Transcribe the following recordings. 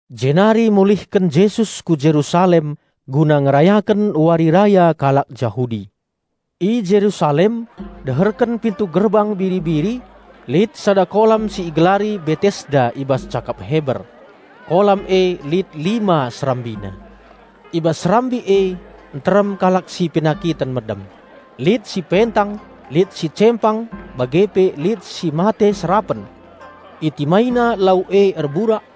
Jenari mulihken Jesus ku Jerusalem guna ngerayaken wari raya kalak Jahudi. I Jerusalem, deherken "Pintu Gerbang Biri-biri," lit sada kolam si igelari Betesda i bas cakap Heber. Kolam e lit lima serambina. I bas serambi e nterem kalak si penakiten medem; lit si pentang, lit si cempang bage pe lit si mate serapen. (Itimaina lau e erburak,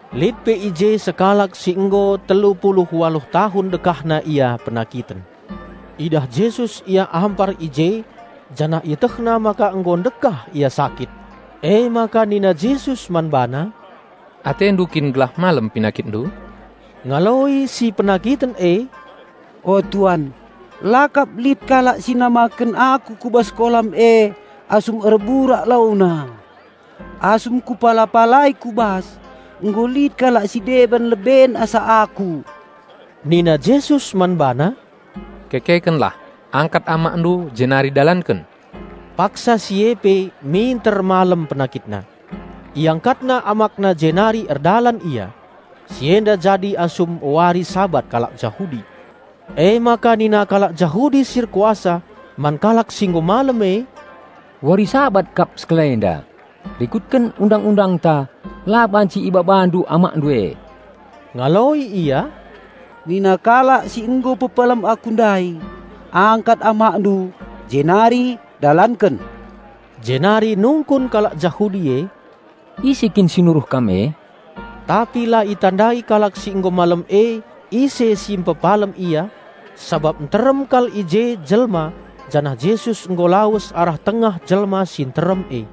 Lit pe i je sekalak si nggo telu pulu waluh tahun dekahna ia penakiten. Idah Jesus ia ampar i je janah IetehNa maka nggo ndekah ia sakit. Emaka nina Jesus man bana, "Atendu kin gelah malem penakitndu?" Ngaloi si penakiten e, "O Tuan, la kap lit kalak si namaken aku ku bas kolam e asum erburak launa; asum kupala-palai ku bas, nggo lit kalak si deban leben asa aku." Nina Jesus man bana, "Kekekenlah, angkat amakndu jenari dalanken!" Paksa si e pe minter malem penakitna. Iangkatna amakna jenari erdalan ia. Si enda jadi asum wari Sabat kalak Jahudi. Emaka nina kalak Jahudi si erkuasa man kalak si nggo malem e, "Wari Sabat kap sekalenda. Rikutken Undang-undangta la banci ibabandu amakndu e." Ngaloi ia, "Nina kalak si nggo pepalem aku ndai, 'Angkat amakndu jenari dalanken.'" Jenari nungkun kalak Jahudi e, "Ise kin si nuruh kam e?" Tapi la itandai kalak si nggo malem e ise si mpepalem ia, sabap nterem kal i je jelma, janah Jesus nggo lawes arah tengah jelma si nterem e.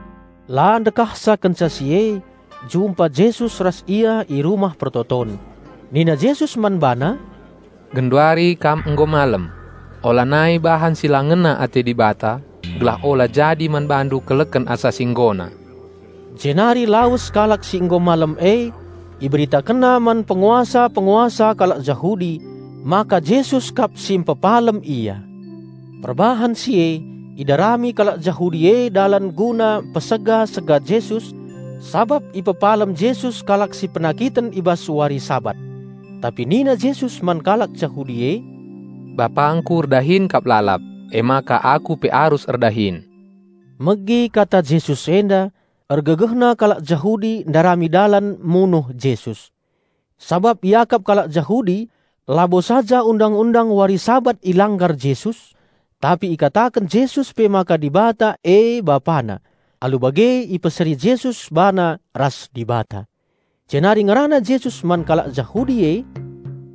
La ndekahsa kenca si e, jumpa Jesus ras ia i Rumah Pertoton. Nina Jesus man bana, "Genduari kam nggo malem; olanai bahan si la ngena ate Dibata, gelah ola jadi man bandu keleken asa si nggona." Jenari lawes kalak si nggo malem e, iberitakenna man penguasa-penguasa kalak Jahudi maka Jesus kap si mpepalem ia. Perbahan si e idarami kalak Jahudi e dalan guna niksa Jesus, sabap ipepalem Jesus kalak si penakiten i bas wari Sabat. Tapi nina Jesus man kalak Jahudi e, "BapangKu erdahin kap lalap; emaka Aku pe arus erdahin." Megi kata Jesus enda, ergegehna kalak Jahudi ndarami dalan munuh Jesus; sabap iakap kalak Jahudi labo saja undang-undang wari Sabat ilanggar Jesus, tapi ikataken Jesus pe maka Dibata e BapaNa, alu bage ipeseri Jesus bana ras Dibata. Jenari ngerana Jesus man kalak Jahudi e,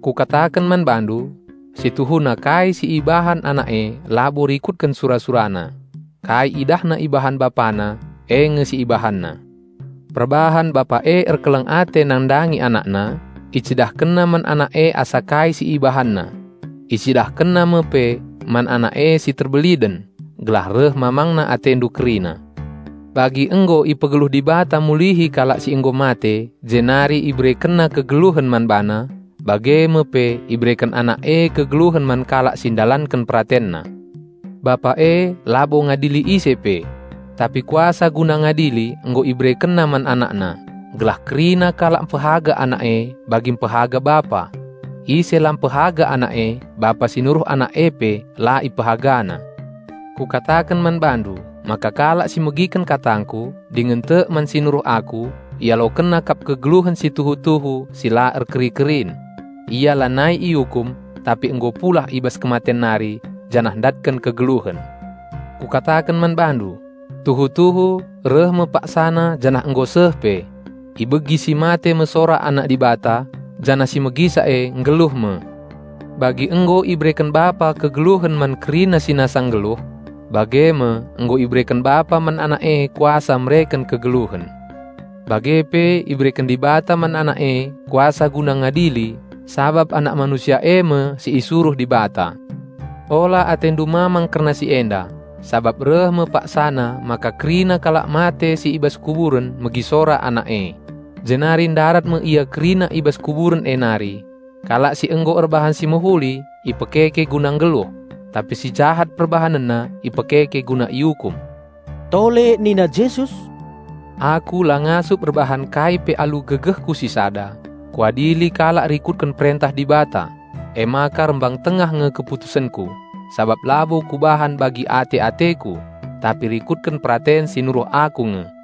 "Kukataken man bandu: Situhuna kai si ibahan Anak e labo rikutken sura-SuraNa. Kai i IdahNa ibahan BapaNa, e nge si IbahanNa. Perbahan Bapa e erkeleng ate nandangi AnakNa, IcidahkenNa man Anak e asa kai si IbahanNa. IcidahkenNa me pe man Anak e si terbeliden, gelah reh mamangna atendu kerina. Bagi nggo ipegeluh Dibata mulihi kalak si nggo mate jenari IberekenNa kegeluhen man bana, bage me pe ibereken Anak e kegeluhen man kalak si ndalanken PeratenNa. Bapa e labo ngadili ise pe. Tapi kuasa guna ngadili nggo IberekenNa man AnakNa, gelah kerina kalak mpehaga Anak e, bagi mpehaga Bapa. Ise la mpehaga Anak e, Bapa si nuruh Anak e pe la ipehagana." "Kukataken man bandu maka kalak si megiken katangKu, dingen tek man si nuruh Aku, ialokenna kap kegeluhen si tuhu-tuhu si la erkeri-kerin. Ia lanai iukum tapi nggo pulah i bas kematen nari janah ndatken kegeluhen. Kukataken man bandu: Tuhu-tuhu reh me paksana janah nggo seh pe; ibegi si mate me sora Anak Dibata, janah si megisa e nggeluh me. Bagi nggo ibereken Bapa kegeluhen man kerina si nasa nggeluh, bage me nggo ibereken Bapa man Anak e kuasa mereken kegeluhen. Bage pe ibereken Dibata man Anak e kuasa guna ngadili sabap Anak Manusia e me si isuruh Dibata. Ola atendu mamang kerna si enda; sabap reh me paksana maka kerina kalak mate si i bas kuburen megi sora Anak e, jenari ndarat me ia kerina i bas kuburen e nari. Kalak si nggo erbahan si mehuli ipekeke guna nggeluh; tapi si jahat perbahanenna ipekeke guna iukum." Tole nina Jesus, "Aku la ngasup erbahan kai pe alu gegehKu sisada; Kuadili kalak rikutken perentah Dibata, emaka rembang tengah nge keputusenKu, sabap labo Kubahan bagi ate-ateKu, tapi rikutken peraten si nuruh Aku nge."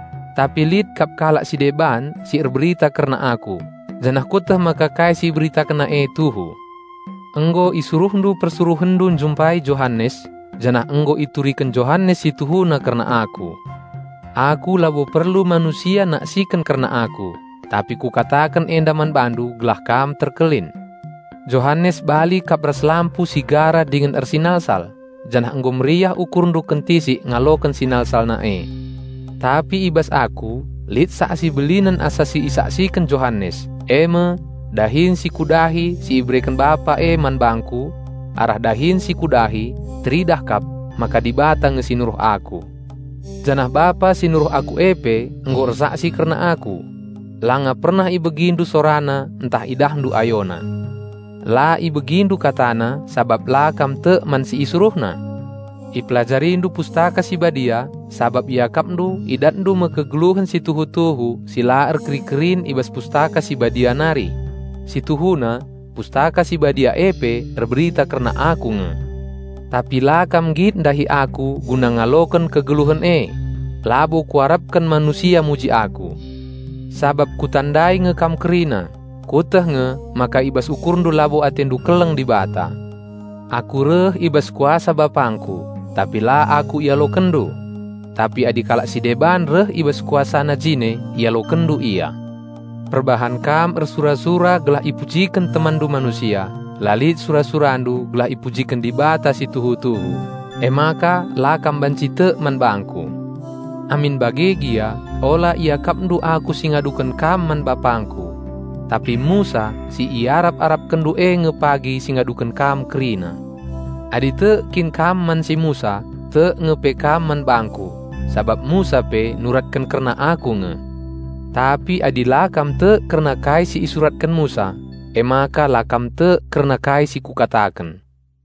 Tapi lit kap kalak si deban si erberita kerna Aku, janah Kueteh maka kai si iberitakenna e tuhu. Nggo isuruhndu persuruhenndu njumpai Johanes, janah nggo ituriken Johanes si tuhuna kerna Aku, Aku labo perlu manusia naksiken kerna Aku, tapi Kukataken enda man bandu gelah kam terkelin. Johanes bali kap ras lampu si gara dingen ersinalsal, janah nggo meriah ukurndu kentisik ngaloken sinalsalna e. Tapi i bas Aku lit saksi belinen asa si isaksiken Johanes, e me: Dahin si Kudahi si ibereken Bapa e man bangKu. Arah dahin si Kudahi, teridah kap maka Dibata nge si nuruh Aku. Janah Bapa si nuruh Aku e pe nggo ersaksi kerna Aku. Langa pernah ibegindu SoraNa ntah idahndu AyoNa. La ibegindu KataNa, sabap la kam tek man si IsuruhNa. Ipelajarindu Pustaka Si Badia sabap iakapndu idatndu me kegeluhen si tuhu-tuhu si la erkeri-kerin i bas Pustaka Si Badia nari. Situhuna Pustaka Si Badia e pe erberita kerna Aku nge! Tapi la kam nggit ndahi Aku guna ngaloken kegeluhen e." "Labo Kuarapken manusia muji Aku. Sabap Kutandai nge kam kerina; Kueteh nge maka i bas ukurndu labo atendu keleng Dibata. Aku reh i bas kuasa BapangKu, tapi la Aku ialokenndu. Tapi adi kalak si deban reh i bas kuasana jine ialokenndu ia. Perbahan kam ersura-sura gelah ipujiken temanndu manusia, la lit sura-surandu gelah ipujiken Dibata si tuhu-tuhu, emaka la kam banci tek man bangKu. Amin bage gia ola iakapndu Aku si ngaduken kam man BapangKu. Tapi Musa si iarap-arapkenndu e nge pagi si ngaduken kam kerina. Adi tek kin kam man si Musa, tek nge pe kam man bangKu, sabap Musa pe nuratken kerna Aku nge. Tapi adi la kam tek kerna kai si isuratken Musa, emaka la kam tek kerna kai si Kukataken."